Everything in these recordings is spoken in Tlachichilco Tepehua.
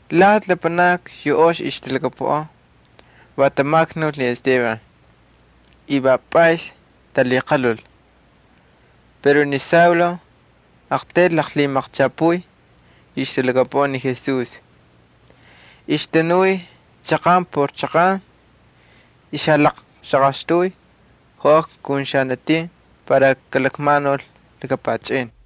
Lati lapanakni yu ox ixtalhakapuꞌan va tamaknul ni Esteban, va pꞌays talhiqalhul. Pero ni Saulo aqtayl laqlhimaqchapuy yu ixtalhakapuꞌan ni Jesús. Ixtanuy jachaqan por jachaqan, ixjalaqxaqaxtuy joꞌakna kun xanatin para kalakmanul laka pachꞌin.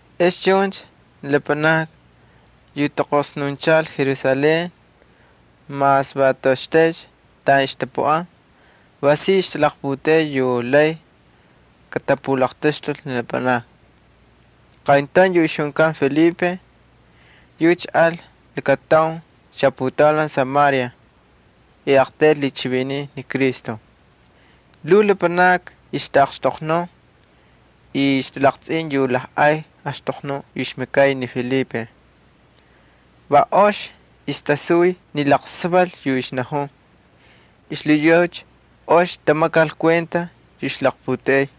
Ex chuncha ni lapanakni yu taqosnunchal Jerusalén mas va toꞌoxtaycha taꞌan ixtapuꞌan va si ixtalaqputeꞌey yu lay katapulaqtaxtul ni lapanakni. Qayntaun yu ixjunkan Felipe, yucha al lakataun xaputaulan Samaria y aqtayl lhichiviniy ni Cristo. Lhuu lapanakni ixtaꞌaqxtoqnun y ixtalaqtsꞌin yu lajꞌay axtoqnuꞌ yu ixmakay ni Felipe. Va ox ixtasuy ni laqsaval yu ixnajun. Xlhiyucha ox tamakal kuenta yu ixlaqputeꞌey.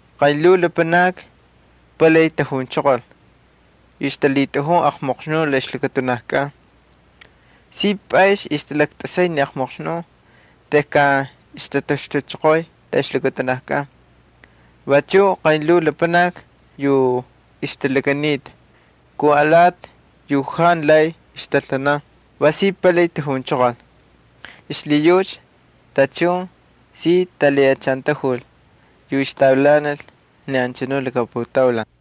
Qaynlhuu lapanakni palay tajunchoqol yu ixtalhitꞌajun jantu ox espíritus la ixlakatunajkꞌan. Si pꞌays ixtalaktꞌasay ni jantu ox espíritus tejkan ixtataxtuchoqoy la ixlakatunajkꞌan. Vachuꞌ qaynlhuu lapanakni yu ixtalakanita kun alati yu jantu lay ixtaltanan va si palay tajunchoqol. Xlhiyucha tachun si talhiꞌachantajul yu ixtavilanal ni anchanu laka putaulan.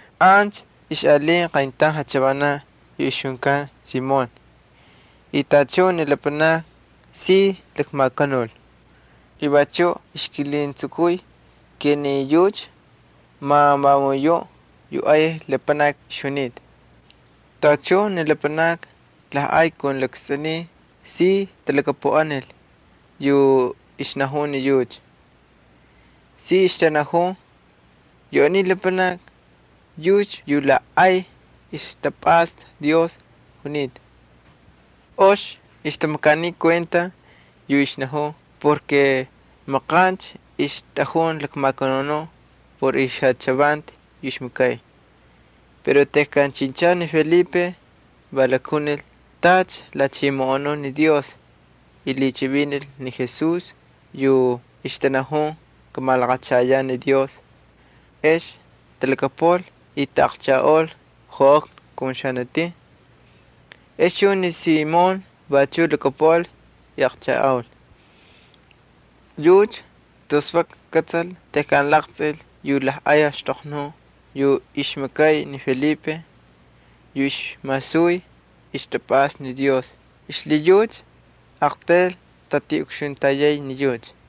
Ancha ixꞌalinta qayntaun jachavanaꞌ yu ixjunkan Simón y tachun ni lapanakni si lakmakanul. Vachuꞌ ixkilhuntsukuy ni yucha ma vamun yuꞌ ay lapanaki ixjunita. Tachun ni lapanakni lajꞌay kun lakstꞌuniy si talhakapuꞌanil yu ixnajun ni yucha. Si ixtanajun: —Yu aniy lapanaki yucha va yu la ay ixtapꞌasta Dios junita. Ox ixtamakaniy kuenta yu ixnajun porke maqancha ixtꞌajun jalakmakanun por ixjachavanti yu ixmakay. Pero tejkan chinchal ni Felipe va jalakjunil tacha lhachimoꞌonun ni Dios y lhichivinil ni Jesús yu ixtanajunta kamalaqachayaꞌ Dios ex talhakapuꞌal y taꞌaqchajꞌaul joꞌakna kun xanatin. Ex chuncha ni Simón vachuꞌ lhakapuꞌal y aqchajꞌaul. Yucha tus vak kꞌatsal tejkan laqtsꞌil yu lajꞌay axtoqnuꞌ yu ixmakay ni Felipe yu ixmasuy ixtapꞌasta ni Dios y xlhiyucha aqtayl tꞌatiꞌukxuntayay ni yucha.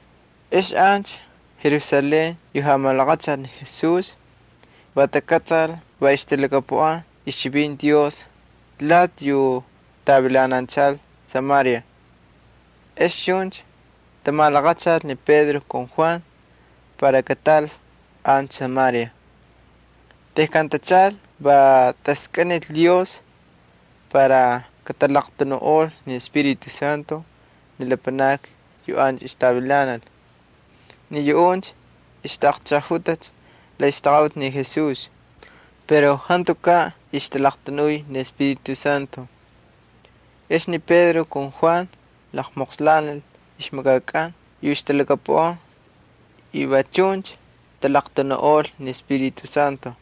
Ex ancha Jerusalén yu jamalaqachal ni Jesús va takꞌatsal va ixtalhakapuꞌanta ixchivinti Dios lati yu tavilananchal Samaria. Ex chuncha tamalaqachal ni Pedro ali Juan para kataꞌal ancha Samaria. Tejkan tachaꞌal va taskꞌinil Dios para katalaqtanuꞌol ni Espíritu Santo ni lapanakni yu ancha ixtavilanal. Ni yuꞌuncha ixtaꞌaqchajꞌajutacha la ixtaqaꞌuti ni Jesús, pero jantukaꞌ ixtalaqtanuy ni Espíritu Santo. Ex ni Pedro ali Juan tamoqslanil ixmakakꞌan yu ixtalhakapuꞌanta y va chuncha talaqtanuꞌol ni Espíritu Santo.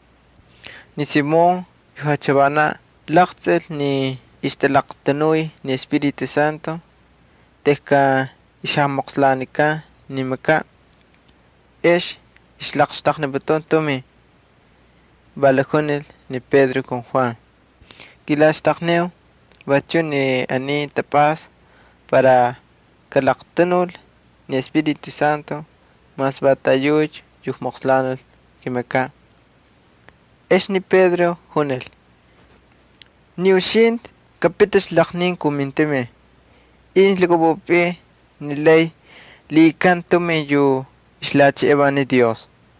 Ni Simón yu jachavanaꞌ jalaqtsꞌil ni ixtalaqtanuy ni Espíritu Santo tejkan ixjamoqslanikan ni ixmakakꞌan, ex ixjalaqxtaqniputun tumin. Va lakjunil ni Pedro ali Juan: —Kilaxtaqniu vachuꞌ ni aniy tapꞌasta para kalaqtanul ni Espíritu Santo mas va taꞌayucha yu kakmoqslanil kimakaꞌ. Ex ni Pedro junil: —Ni uxintꞌi kapiticha laqnin kun mintumin incha lhakꞌapꞌupꞌin ni lay lhiꞌikan tumin yu xtaꞌa ni Dios.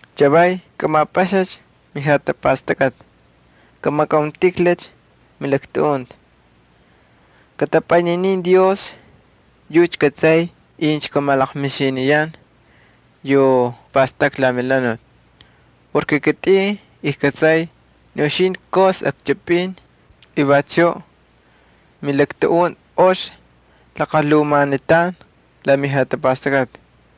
Chavay kꞌamapꞌaxacha mijatapastakꞌati, kamakꞌauntꞌijlacha milaktuꞌunti. Kꞌatꞌapꞌayninin Dios, yucha kꞌatsay incha kamalaqmixiniyan yu pꞌastꞌakꞌa la melhanuti. Kitꞌin ijkꞌatsay ni uxintꞌi ayaj akchꞌipꞌin y vachuꞌ milaktuꞌunti ox laqalhumanitan la mijatapastakꞌati.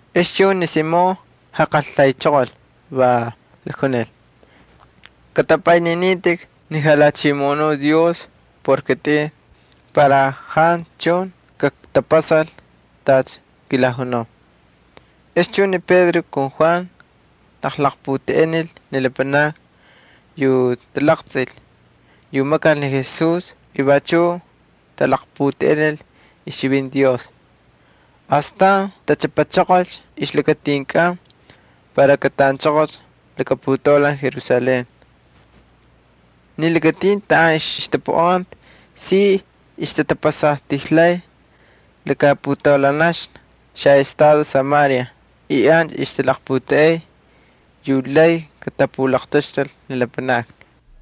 Ex chuncha ni Simón jaqaltaychoqol va lakjunil: —Kꞌatꞌapꞌayninitꞌik ni jalhachimoꞌonuꞌ Dios por kitꞌin para jantu chun kaktapasal tacha kilajunau. Ex chuncha ni Pedro ali Juan jalaqputeꞌenil ni lapanakni yu talaqtsꞌil yu makal ni Jesús y vachuꞌ talaqputeꞌenil ixchivinti Dios. Astan tachꞌapachoqolcha ixlakatinkꞌan para kataꞌanchoqolcha laka putaulan Jerusalén. Ni lakatin taꞌan ixtapuꞌanta si ixtatapasatijlay laka putaulanaxna xaꞌestado Samaria y ancha ixtalaqputeꞌey yu lay katapulaqtaxtul ni lapanakni.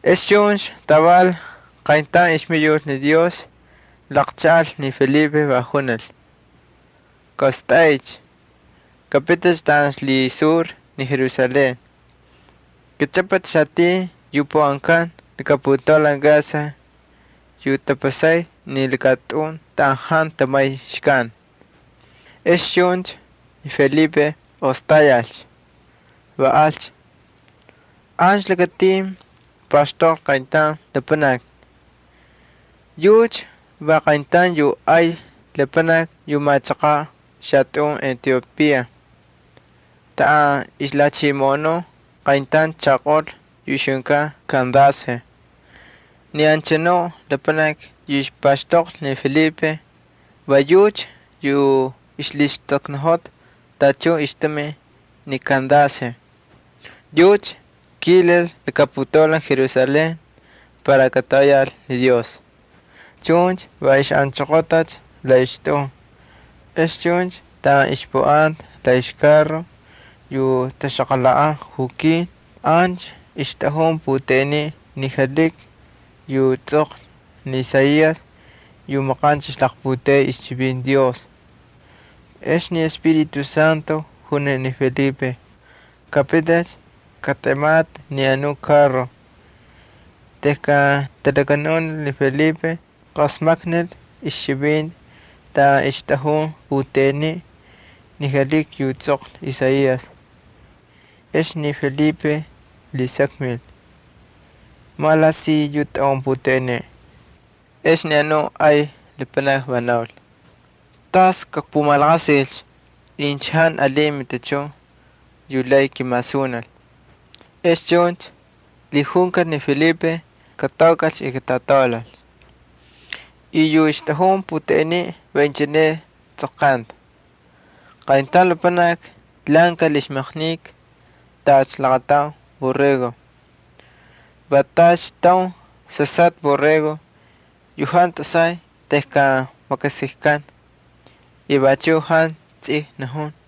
Ex chuncha taval qayntaun ixmayul Dios laqchaꞌal ni Felipe, va junil: —Kaꞌostꞌaycha, kapiticha taꞌan ixlhisur ni Jerusalén. Kꞌachꞌapꞌa xatin yu puꞌankan laka putaulan Gaza yu tapasay ni lakatꞌun taꞌan jantu matichun kataulal. Ex chuncha ni Felipe ostayal, va alcha. Ancha lakatin paxtoqlhi qayntaun lapanaki. Yucha va qayntaun yu ay lapanaki yu machaqaꞌ xalakatꞌun Etiopía taꞌan ixlhachimoꞌonun qayntaun xanati yu ixjunkan Kandace. Ni anchanu lapanaki yu paxtoqlhi ni Felipe va yucha yu ixlhistakniꞌojota tachun ixtumin ni Kandace. Yucha kilal laka putaulan Jerusalén para katoꞌoyal ni Dios. Chuncha va ixꞌanchoqotacha la ixtꞌun. Ex chuncha taꞌan ixpuꞌanta la ixkarro yu taxaqalhaꞌan jukin ancha ixtꞌajun puteꞌeniꞌ ni jalhiki yu tsꞌoqlhi ni Isaías yu maqancha ixlaqputeꞌey ixchivinti Dios. Ex ni Espíritu Santo junil ni Felipe: —Kapiticha, katꞌematꞌi ni anu karro. Tejkan talakanunil ni Felipe, qasmaknil ixchivinti taꞌan ixtꞌajun puteꞌeniꞌ ni jalhiki yu tsꞌoqlhi Isaías yu maqancha ixlaqputeꞌey ixchivinti Dios. Ex ni Felipe lhisakmil: —¿Malaꞌasiy yu tꞌaꞌun puteꞌeniꞌ? Ex ni anu ay lapanaki va naul: —¿Tas kakpumalaqasilcha incha jantu alin matichun yu lay kimasunil? Ex chuncha lhijunkal ni Felipe kataukꞌalcha y katꞌataulal. Yu ixtꞌajun puteꞌeniꞌ va inchine istsꞌoqkanta: Qayntaun lapanaki lhaꞌankal ixmaqnika tacha laqataun borrego. Va tacha taun sasꞌatꞌa borrego yu jantu tꞌasay tejkan makasikkan, yucha vachuꞌ jantu tsij najun.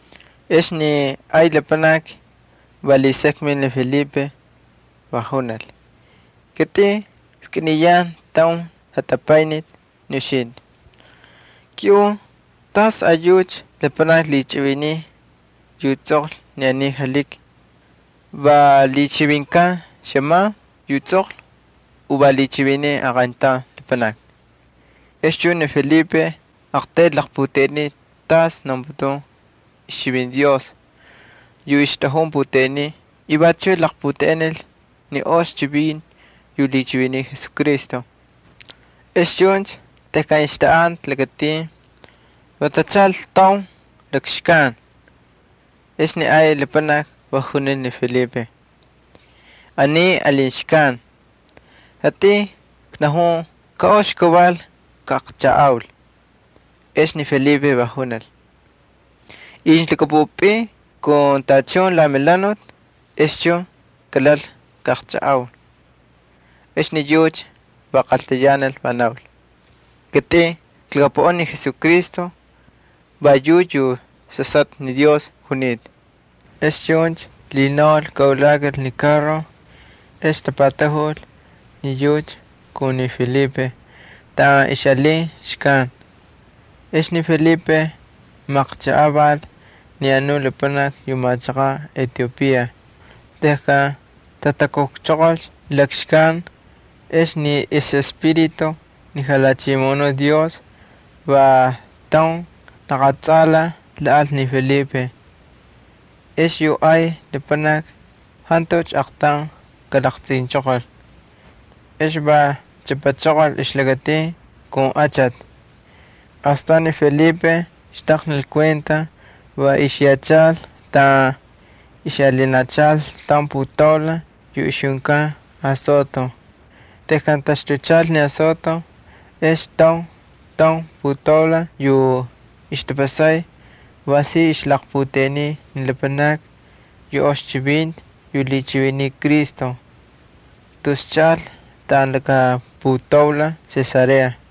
Ex ni ay lapanaki va lhisakmil ni Felipe, va junil: —Kitꞌin kskꞌiniyan taun jatapayniti ni uxintꞌi, kiꞌun tasꞌayucha lapanaki lhichiviniy yu tsꞌoqlhi ni aniy jalhiki. ¿Va lhichivinkan xꞌaman yu tsꞌoqlhi u va lhichiviniy aqayntaun lapanaki? Ex chuncha ni Felipe aqtaylcha laqputeꞌeniy tacha naunputun ixchivinti Dios yu ixtꞌajun puteꞌeniꞌ y vachuꞌ laqputeꞌenil ni ox chivinti yu lhichiviniy Jesucristo. Ex chuncha tejkan ixtaꞌanta lakatin va tachaꞌal taun lakxkan. Ex yu ay lapanaki va junil ni Felipe: —Aniy alin xkan. Kitꞌin knajun ka ox kaval kajkꞌaqchajꞌaul. [Ex ni Felipe va junil: —Incha lhakꞌapꞌupꞌin kun tachun la melhanuti ex chun kalal kꞌaꞌaqchꞌajꞌau. Ex ni yucha va qaltayanal, va naul: —Kitꞌin klhakapuꞌan ni Jesucristo va yucha yu Sasꞌatꞌa Dios junita.] Ex chuncha lhinaul kaꞌulakal ni karro. Ex tapatajul ni yucha kun ni Felipe taꞌan ixꞌalin xkan. Ex ni Felipe maqchajꞌaval ni anu lapanaki yu machaqaꞌ Etiopía. Tejkan tatakukchoqolcha lakxkan ex ni ixꞌEspíritu ni Jalhachimoꞌonuꞌ Dios va taun laqatsꞌalaj lhaꞌal ni Felipe. Ex yu ay lapanaki jantucha aqtaun kalaqtsꞌinchoqol. Ex va chꞌapachoqolcha ixlakatin kun achati. Astan ni Felipe xtaqnil kuenta va ixyachal taꞌan ixꞌalinachal taun putaulan yu ixjunkan Azoto. Tejkan taxtuchal ni Azoto ex taun taun putaulan yu ixtapasay va si ixjalaqputeꞌeniy ni lapanakni yu ox chivinti yu lhichiviniy Cristo, tus chaꞌal taꞌan laka putaulan Cesarea.